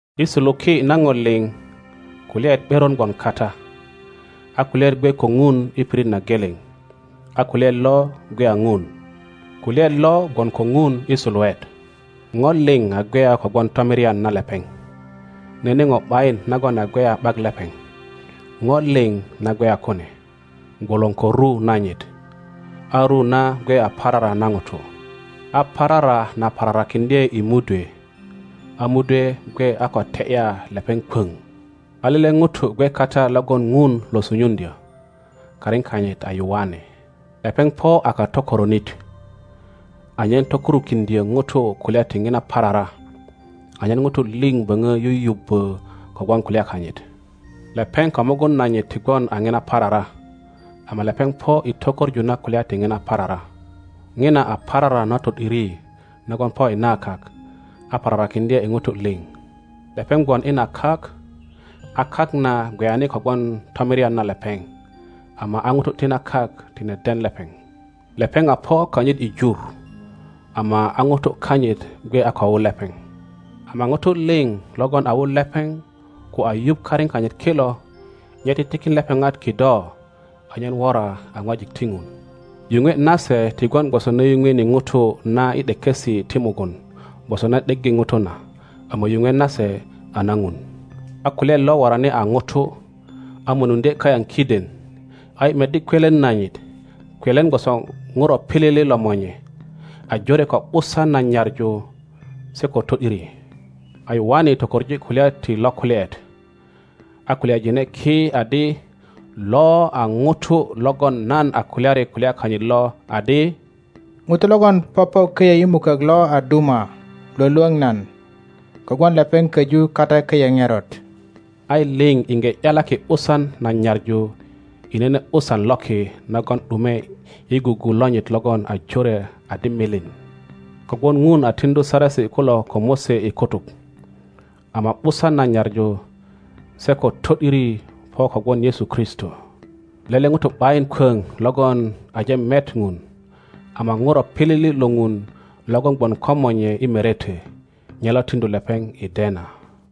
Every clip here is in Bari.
I suluki na ŋo liŋ, Kulyaet ’beron gwon kata, a Kulyaet gwe ko Ŋuni pirit na geleŋ, a Kulyaet lo gwe a Ŋun. Kulyaet lo gwon ko Ŋun i suluet. Ŋo liŋ a gweya kogwon tomirian na lepeŋ, nene ŋo ’bayin nagon a gweya ’bak lepeŋ. Ŋo liŋ na gweya kune gwolon ko ru nanyit, a ru na gwe a parara na ŋutu. A pararan la pararakiŋdye i mudwe, a mudwe gwe a ko te ’ya lepeŋ kwoŋ. A lele ŋuto gwe kata, logon Ŋun lo sunyuŋdyo; karin kanyit a Yoane. Lepeŋ po a katokoronit, anyen tokurukiŋdyo ŋutu kulya ti ŋina parara, anyen nutu liŋ boŋo yuyubbo kogwon kulya kanyit. Lepeŋ ko mugun nanyit ti gwon a ŋina parara, ama lepeŋ po i to koŋu na kulya ti ŋina parara. ŋina a parara na to ’diri nagon po i na kak, a pararakiŋdye i ŋutu liŋ. Lepeŋ gwon i na kak, a kak na gweyani kogwon tomirian na lepeŋ, ama a ŋutu ti na kak tine den lepeŋ. Lepeŋ a po kanyit i jur, ama a ŋutu kanyit gwe a ko wu lepeŋ. Ama ŋutu liŋ logon a wu lepeŋ ko a yuŋ karin kanyit kilo, nye titikin lepeŋat kido anyen wora a ŋwajik ti Ŋun. Yuŋwe nase ti gwon gwoso na yuŋweni ŋutu na i ’dekesi ti mugun gwoso na ’deggi ŋutu na, ama yuŋwe nase a na Ŋun. A Kulyaet lo worani a ŋuto, a mönuŋdye kayaŋ kiden, a yi meddi kwelen nanyit, kwelen gwoso ŋuro pilili lo Monye, a jore ko ’busan na nyaŋu se ko to ’diri. A Yoane tokoŋ kulya ti lo Kulyaet, a kulyajine ki adi, Lo a ŋuto logon nan a kulyari kulya kanyit lo adi, ŋuto logon popo koyo i mukok lo a duma Iwolwoŋ nan, kogwon lepeŋ koju kata koyo ŋerot. A yi liŋ iŋge ’yalaki ’busan na nyaŋu i nene ’busan loki nagon ’dumwe i gugu lonyit logon a jore adi milin. Kogwon ŋun a tiŋdu Saresi kulo ko Mose i kutuk, ama ’busan na nyaŋu se ko to ’diri po kogwon Yesu Kristo. Lele ŋuto ’bayin kwoŋ logon aje met ŋun, ama ŋuro pilili lo Ŋun logon gwon ko Monye i merete, nye lo tiŋdu lepeŋ i dena.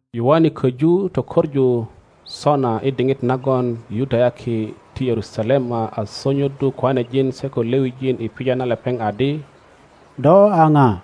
Yoane koju tökoŋu sona i diŋit nagon Yudayaki ti Yerusalema a sonyoddu koanejin se ko Lewijin i pija na lepeŋ adi, Do a pa?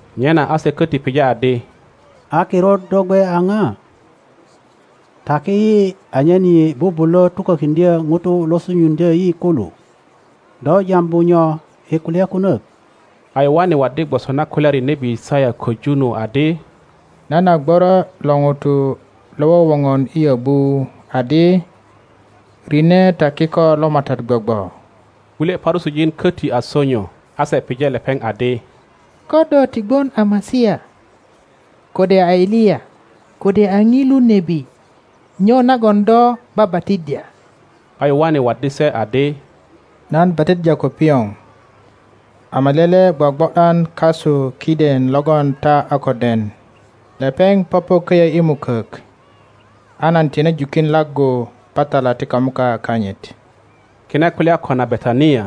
Nyena a se köti pije adi, A kirut do gwe a ija? Taki yi anyen yi bubulö tukökiŋdyö nutu lo sunyuŋdyö yi kulu. Do jambu nyo i kulya kunök? A Yoane waddi gwoso na kulyari nebi Yisaya köju nu adi, Nan a gworo lo ŋuto lo wowoŋon i yöbu adi, Rine ta kiko lo MATAT gwogwo. Kulye Parusijin köti a sonyo, a se pije lepeŋ adi, Ko do ti gwon a Masia, kode a Eliya, kode a ŋilu nebi, nyo nagon do babatiddya? a Yoane waddi se adi, Nan batiddya ko pioŋ. Ama lele gwogwo ’dan kasu kiden logon ta a ko den; lepeŋ popo köyö i mukök, a nan tine jukin laggu patala ti kamuka kanyit. Kine kulya kona Betania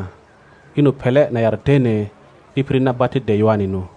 i nu pele na Yardene i pirit na batiddye Yoane nu.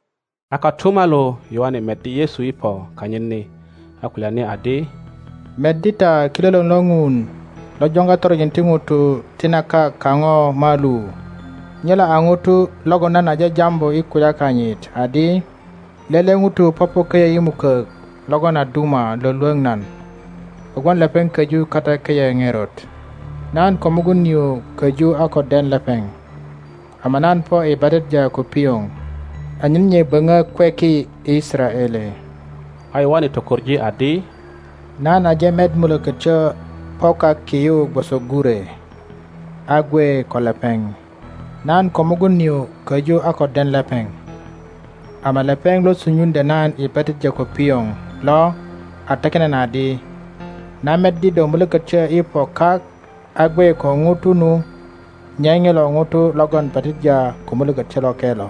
A kotumalu Yoane meddi Yesu i po kanyit ni, a kulyani adi, Meddi ta Kilolor lo ŋun lo joŋga toronjin ti ŋutu ti na kak kapo malu! ŋilo a ŋuto logon nan aje jambu i kulya kanyit adi, Lele ŋuto popo köyö i mukök logon a duma lwölwöŋ nan, kogwon lepeŋ köju kata köyö ŋerot. Nan ko mugun nio köju a ko den lepeŋ, ama nan po i batiddya ko pioŋ anyen nye böŋö kweki i Yisaraele. A Yoane tokoŋ adi, Nan aje met Mulökotyo po kak ki yu gwoso gure, a gwe ko lepeŋ. Nan ko mugun nio köju a ko den lepeŋ, ama lepeŋ lo sunyuŋdyö nan i batiddya ko pioŋ lo a takin nan adi, Na meddi do Mulökötyo i po kak a gwe ko ŋuto nu, nye ŋilo ŋuto logon batiddya ko Mulökötyo Loke lo.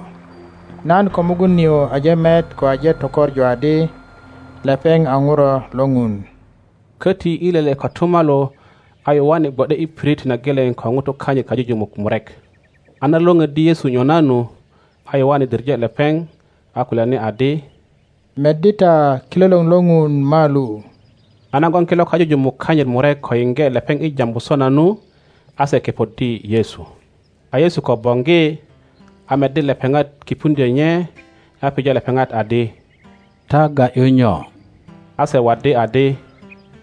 Nan ko mugun nio aje met ko aje tökoŋu adi lepeŋ a Ŋuro lo Ŋun. Köti i lele kotumalu, a Yoane gwo ’de i pirit na geleŋ ko ŋutu kanyit kajujumuk murek; a na lwöŋoddi Yesu nyona nu, a Yoane diŋe lepeŋ, a kulyani adi, Meddi ta Kilolor lo ŋun malu! A nagon kilo kajujumuk kanyit murek ko yiŋge lepeŋ i jambu sona nu, a se kepoddi Yesu. A Yesu ko boŋgi, a meddi lepeŋat kipuŋdyö nye, a pije lepeŋat adi, Ta ga ’yu nyo? A se waddi adi,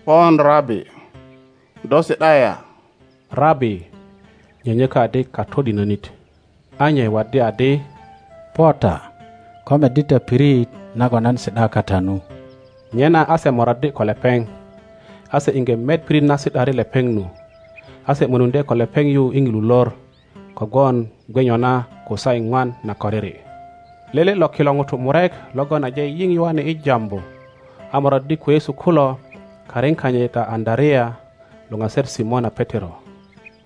Pon Rabi, do si ’da ya? (Rabi nyönyökö adi Katodinönit.) A nye waddi adi, Po ta, ko meddi ta pirit nagon nan si ’da kata nu. Nyena a se moraddi ko lepeŋ, a se iŋge met pirit na si ’dari lepeŋ nu, a se mönuŋdye ko lepeŋ yu i ŋilu lor, kogwon gwe nyona ko saa iŋwan na koriri. Lele lo kilo ŋutu murek logon aje yiŋ Yoane i jambu, a moraddi ko Yesu kulo, karin kanyit a Andarea luŋaser Simona Petero.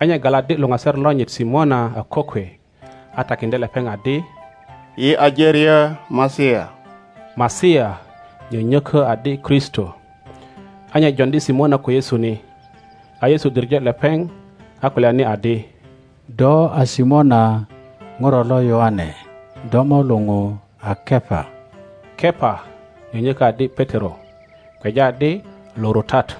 A nye galaddi luŋaser lonyit Simona a kokwe, a takiŋdye lepeŋ adi, Yi aje ryö Masia. (Masia nyönyökö adi Kristo). a nye joŋdi Simona ko Yesu ni. A Yesu diŋe lepeŋ, a kulyani adi, Do a Simona ŋuro lo Yoane; do mo luŋu a Kepa. (Kepa nyönyökö adi Petero, kweja adi Lurutar.)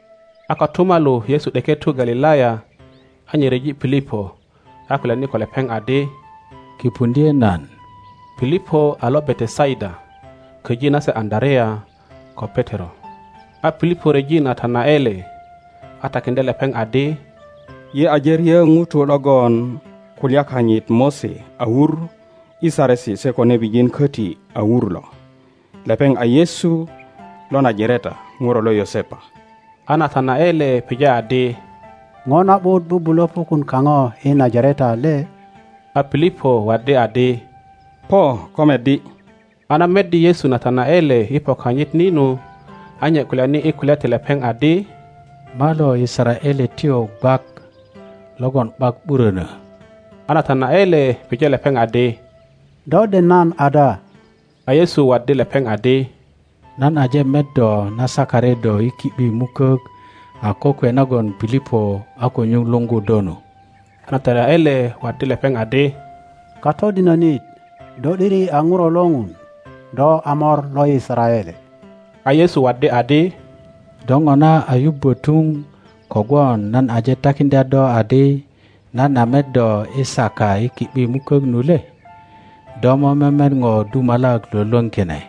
A kotumalu Yesu ’deke tu Galilaya, a nye ryeji Pilipo, a kulyani ko lepeŋ adi, Kipuŋdye nan. pilipo a lo Betesaida, köji nase Andarea ko Petero. a Pilipo ryeji Natanaele, a takiŋdye lepeŋ adi, Yi aje ryö ŋuto logon kulya kanyit Mose a wur i Saresi se ko nebijiin koti a wur lo, lepeŋ a Yesu lo Najareta, ŋuro lo Yosepa. a Natanaele pije adi, ŋo na ’but bubulo pukun kaŋo i Najareta le? A Pilipo waddi adi, Po ko meddi. A na meddi Yesu Natanaele i po kanyit ni nu, a nye kulyani i kulya ti lepeŋ adi, Malo Yisaraeletyo gwak logon ’bak ’burönö! A Natanaele pije lepeŋ adi, Do den nan ada? A Yesu waddi lepeŋ adi, Nan aje met do na sakari do i ki ’bi mukok a kokwe nagon Pilipo a ko nyuŋ luŋgu do nu. a Natanaele waddi lepeŋ adi, Katodinönit, do ’diri a Ŋuro lo Ŋun; do a Mor lo Yisaraele. A Yesu waddi adi, Do ŋona a yubbö tuŋ kogwon nan aje takiŋdya do adi nan a met do i saka i ki ’bi mukök nu le? Do mo memet Ŋo dumalak lwölwöŋ kine.